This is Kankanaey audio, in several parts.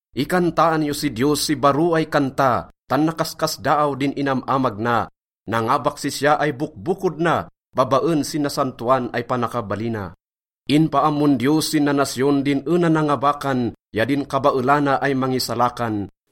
Ikantaan yo si Diyos si baro ay kanta, tan nakaskasdaaw din inam-amag na. Nangabak sisya ay bokbokod na babaen sin nasantoan ay panakabalina. Inpaammon Diyos sin nanasyon din ena nangabakan ya din kabaelana ay mangisalakan.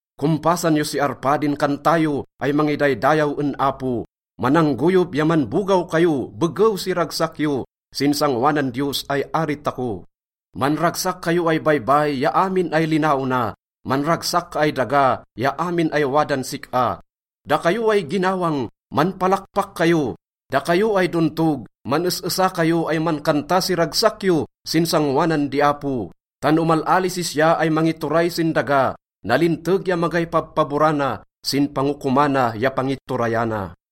Kompasan yo si arpa din kanta yo ay mangidaydayaw en Apo. Mananggoyob ya manbogaw kayo begew si ragsak yo sin sangoanan Diyos ay ari tako. Manragsak kayo ay baybay ya amin ay linaona, manragsak ka ay daga ya amin ay wadan sik-a. Dakayo ay ginawang, manpalakpak kayo, dakayo ay dontog, man-es-esa kayo ay mankanta si ragsak yo sin sangoanan di Apo. Tan omal-ali sisya ay mangituray sin daga, nalinteg ya magay pabpaborana sin pangokomana ya pangiturayana.